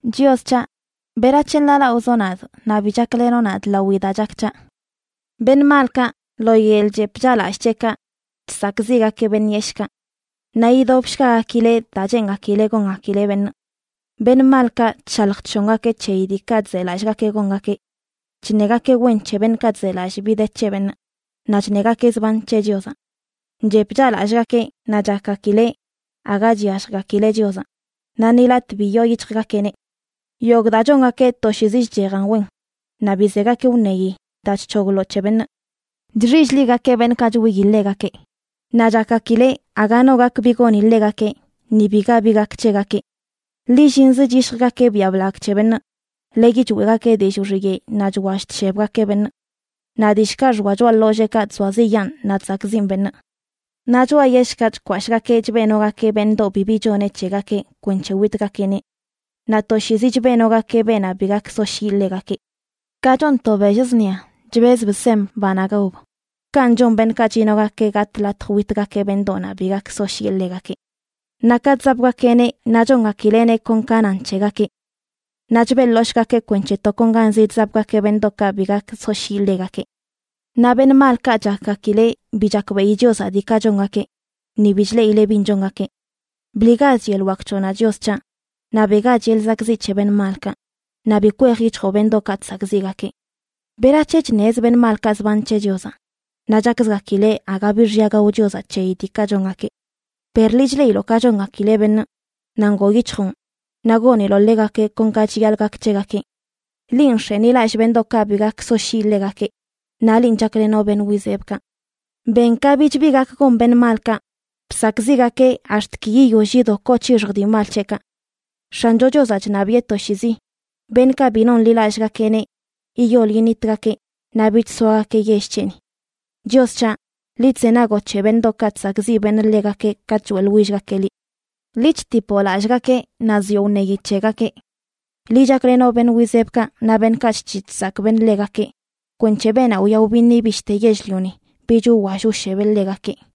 Chios c̱haꞌ, ¿berac̱he nḻaalaꞌozoꞌ nadꞌ, naꞌ bi chaklenoꞌ nadꞌ lawi daa chak c̱haꞌ? Beṉꞌ malkaꞌ lo yeḻꞌ chep chaꞌlallꞌ c̱heꞌkaꞌ chsakꞌziꞌgakeꞌ beṉꞌ yeshꞌkaꞌ. Naꞌ yidobshgagakileꞌ daa cheengakileꞌ gongakileꞌ beṉꞌ. Beṉꞌ malkaꞌ chshalj chshongakeꞌ c̱heyi diikaꞌ chzelallꞌgakeꞌ gongakeꞌ. Chṉegakeꞌ wen c̱he beṉꞌkaꞌ chzelallꞌ bi de c̱he beṉꞌ, naꞌ chṉegakeꞌ zban c̱he Chiozaꞌ. Chep chaꞌlallꞌgakeꞌ naꞌ chakgakileꞌ aga chyalljgakileꞌ Chiozaꞌ, naꞌ ni latꞌ bi yooyic̱hjgakeꞌneꞌ. Yogꞌ daa chongakeꞌ toshiizi chchejan wen, naꞌ bi zegakeꞌ wṉeyi daa chc̱hogloꞌ c̱he beṉꞌ. Chxill-ligakeꞌ beṉꞌkaꞌ chwiyi ḻegakeꞌ. Naꞌ chakgakileꞌ aga no gak bi goni ḻegakeꞌ; ni biga bi gak c̱hegakeꞌ. Lillinzə chyishjgakeꞌ biaꞌ blagꞌ c̱he beṉꞌ, leyi choeꞌgakeꞌ dillꞌ wxiyeꞌ naꞌ chwall chshebgakeꞌ beṉꞌ. Naꞌ dillꞌkaꞌ xoa choꞌa ḻolleekaꞌ chzoaziꞌyaan naꞌ chsakꞌziꞌn beṉꞌ. Naꞌ choꞌa yellkaꞌ chkwashꞌgakeꞌ chbeꞌnogakeꞌ beṉꞌdoꞌ bibi choneꞌ c̱hegakeꞌ kwenc̱he witgakeꞌneꞌ. Naꞌ toshiizi chbeꞌnogakeꞌ beenaꞌ bi gak soshyiꞌ ḻegakeꞌ. Ka chon to bell zṉia, chbezb sem banaꞌ gaob, kanꞌ chon beṉꞌkaꞌ chinogakeꞌ gatꞌ latj witgakeꞌ beṉꞌdoꞌnaꞌ bi gak soshyiꞌe ḻegakeꞌ. Naꞌ ka chzapgakeꞌneꞌ naꞌ chongakileꞌneꞌ kon ka nan c̱hegakeꞌ. Naꞌ chbeꞌḻoshꞌgakeꞌ kwenc̱he tokonganzi chzapgakeꞌ beṉꞌdoꞌkaꞌ bi gak soshyiꞌ ḻegakeꞌ. Naꞌ beṉꞌ malkaꞌ chakgakileꞌ bi chakbeꞌi Chiozaꞌ diikaꞌ chongakeꞌ, ni bi chleꞌileꞌ bin chongakeꞌ. Bliꞌgach yeḻꞌ wak c̱hoꞌnaꞌ, Chios c̱haꞌ, naꞌ beꞌgach yeḻꞌ zakꞌziꞌ c̱he beṉꞌ malkaꞌ. Naꞌ bi kwej yic̱hjoꞌ beṉꞌdoꞌkaꞌ chsakꞌziꞌgakeꞌ. ¿Berac̱he chṉez beṉꞌ malkaꞌ zban c̱he Chiozaꞌ? Naꞌ chakzgakileꞌ aga bi xya gao Chiozaꞌ c̱heyi diikaꞌ chongakeꞌ. Per liꞌ chleꞌiloꞌ ka chongakileꞌ beṉꞌ, naꞌ ngoo yic̱hjoꞌn, naꞌ goniloꞌ ḻegakeꞌ kon ka chiyaḻꞌ gak c̱hegakeꞌ. Linꞌ nx̱enilallꞌ beṉꞌdoꞌkaꞌ bi gak soshyiꞌ ḻegakeꞌ, naꞌ linꞌ chaklenoꞌ beṉꞌ wizebkaꞌ. Ben ka bich bi gak gon beṉꞌ malkaꞌ. Bsakꞌziꞌgakeꞌ ax̱t ki yiyoll yido koo c̱hixj dii mal c̱heꞌkaꞌ. X̱ancho Chiozaꞌ chṉabiꞌe toshiizi. Beṉꞌkaꞌ bi nonḻilallꞌgakeꞌneꞌ yiyol yinitgakeꞌ naꞌ bich soagakeꞌ yell c̱heꞌni. Chios c̱haꞌ, liꞌ chzenagoꞌ c̱he beṉꞌdoꞌkaꞌ chsakꞌziꞌ beṉꞌ ḻegakeꞌ katꞌ choeꞌḻwillgakeꞌ liꞌ. Liꞌ chtipoꞌ lallꞌgakeꞌ naꞌ zioꞌ wṉeyi c̱hegakeꞌ. Liꞌ chaklenoꞌ beṉꞌ wizebkaꞌ naꞌ beṉꞌkaꞌ chc̱hiꞌ chsakꞌ beṉꞌ ḻegakeꞌ, kwenc̱he beenaꞌ wyaꞌ wbiṉi bishte yell-lioni, bich wwall wshebeꞌ ḻegakeꞌ.